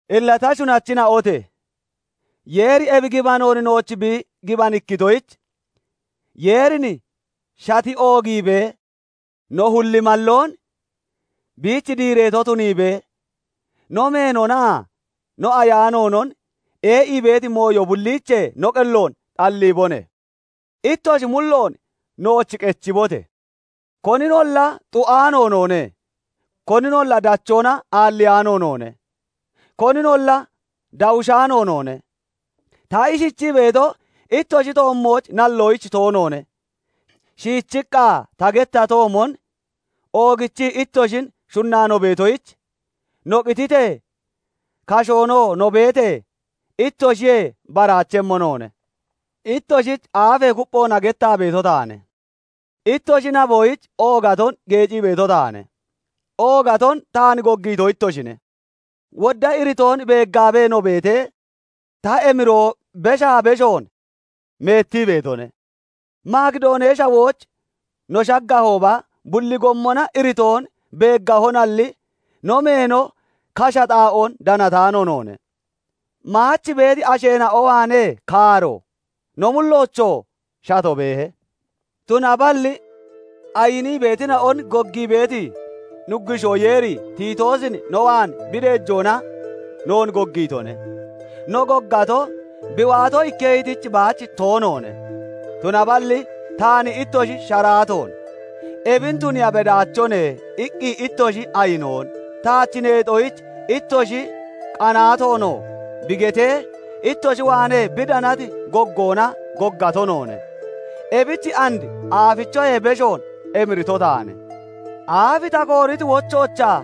Illa ta shunachina'ote! Yeeri ebi gibanoon nooch bi gibanikkitoyich, Yeerin shati oogiibee, no hullimalloon biich diireeto tuniibee, no meenonaa no ayaanoonon ee'ii beeti mooyo bulliichee no qelloon xalliibone. Ittoshi mulloon nooch qechibote! Koninolla xu'aano noone; koninolla dachoona aalliyaano noone; koninolla dawushaano noone. Ta ishichii beeto, ittoshi toommooch nalloyich toonoone; shiichiqqa ta gettatoomon, oogichii ittoshin shunnaa no beetoyich, no qititee, kashoonoo no beetee, ittoshiyee baraachemmo noone. Ittoshich aafee kupphoona gettaa beeto taane; ittoshi naboyich oogaton geecii beeto taane; oogaton taan goggiito ittoshine; wodda iritoon beeggaabee no beetee, ta emiroo beshaa beshoon meettii beetone. Makidoonee Shawooch no shaggahooba, bulli gommona iritoon beeggahonalli, no meeno kasha xaa'oon danataanoone; maach beeti asheena'o waanee kaaro, no mulloochoo shato beehe. Tunaballi ayinii beetina'on goggii beeti Nuggushoo Yeeri Tiitoosin no waan bi deejoona noon goggiitone. No goggato, bi waato ikketoyich baach toonoone; tunaballi taan ittoshi sharaatoon, "Ebin tuniiya bedaachone" iqqi ittoshi ayinoon, taach neexoyich ittoshi qanaatoonoo bi getee, ittoshi waanee bi danati goggoona goggato noone. Ebich and aafichoyee beshoon emirito taane. Aaf ta kooriti wochoochaa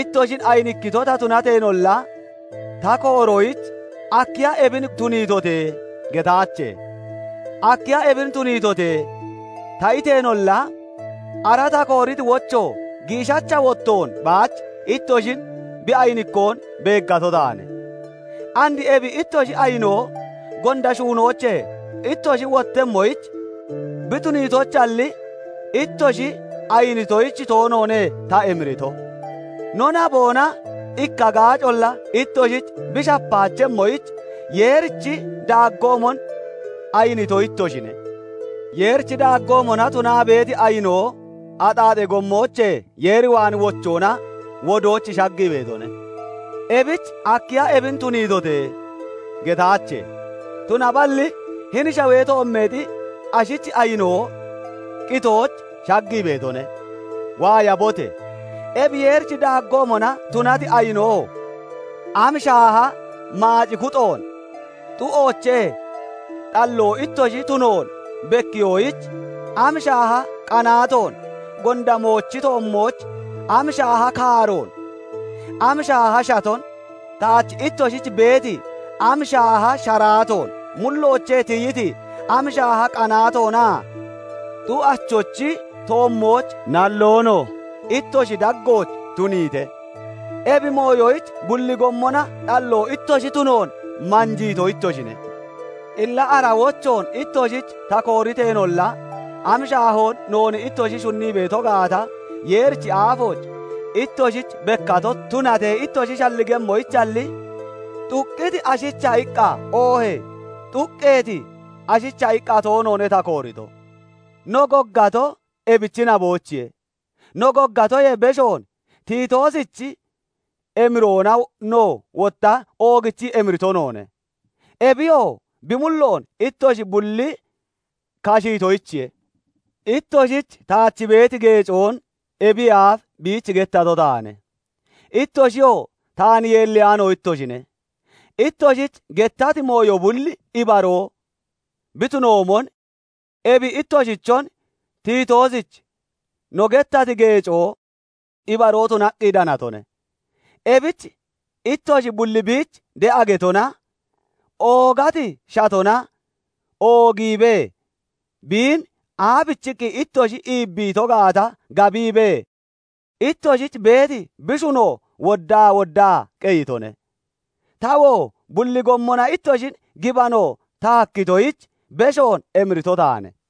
ittoshin ayinikkito ta tunateenolla, ta kooroyich "Akkiya ebin tuniitote?" getaache; "Akkiya ebin tuniitote?" ta iteenolla, ara ta kooriti wocho giishacha wottoon baach ittoshin bi ayinikkoon beeggato taane. And ebi ittoshi ayinoo gonda shuunoochee ittoshi wottemmoyich bi tuniitoyichalli, ittoshi ayinitoyich toonoone ta emirito. No naboona ikka gaacolla ittoshich bi shapaachemmoyich, Yeerichi daaggoomon ayinito ittoshine. Yeerichi daaggoomona tunaa beeti ayinoo axaaxee gommoochee Yeer waan wochoona wodooch shaggii beetone; ebich "Akkiya ebin tuniitote?" getteyaache; tunaballi hini shawee toommeexi ashichi ayinoo qitooch shaggii beetone. Waayabote! Ebi Yeerichi daaggoomona tunati ayinoo am shaaha maac kuxoon, xu'oochee xalloo ittoshi tunoon bekkiyoyich am shaaha qanaatoon, gonda moochi toommooch am shaaha kaaroon, am shaaha shaton, taach ittoshich beeti am shaaha sharaatoon, mulloochee tiyiti am shaaha qanaatoonaa xu'achochi toommooch nalloonon ittoshi daggooch tuniite! Ebi mooyoyich bulli gommona xalloo ittoshi tunoon manjiito ittoshine. Illa ara wochoon ittoshich ta kooriteenolla, am shaahoon noon ittoshi shunnii beeto gaata Yeerichi aafooch ittoshich bekkato tunatee ittoshi shalligemmoyichalli, xuqqiti ashicha iqqa, oohee xuqqeeti ashicha iqqa toonoone ta koorito; no goggatoo ebichi naboyichiye. No goggatoyee beshoon Tiitoosichi emiroona no wotta oogichii emirito noone; ebiyoo bi mulloon ittoshi bulli kashiitoyichiye. Ittoshich taach beeti geecoon ebiyee aaf biich gettato taane; ittoshiyoo taan yeelliyaano ittoshine; ittoshich gettati mooyo bulli ibaroo bi tunoomon, ebi ittoshichon Tiitoosich no gettati geecoo ibaroo tunaqqi danatone. Ebich ittoshi bulli biich de'a getona, oogati shatona oogiibee biin aabichiqqi ittoshi iibbiito gaata gabiibee, ittoshich beeti bi shuno woddaa woddaa qeyitone. Tawoo bulli gommona ittoshin gibano ta hakkitoyich, beshoon emirito taane.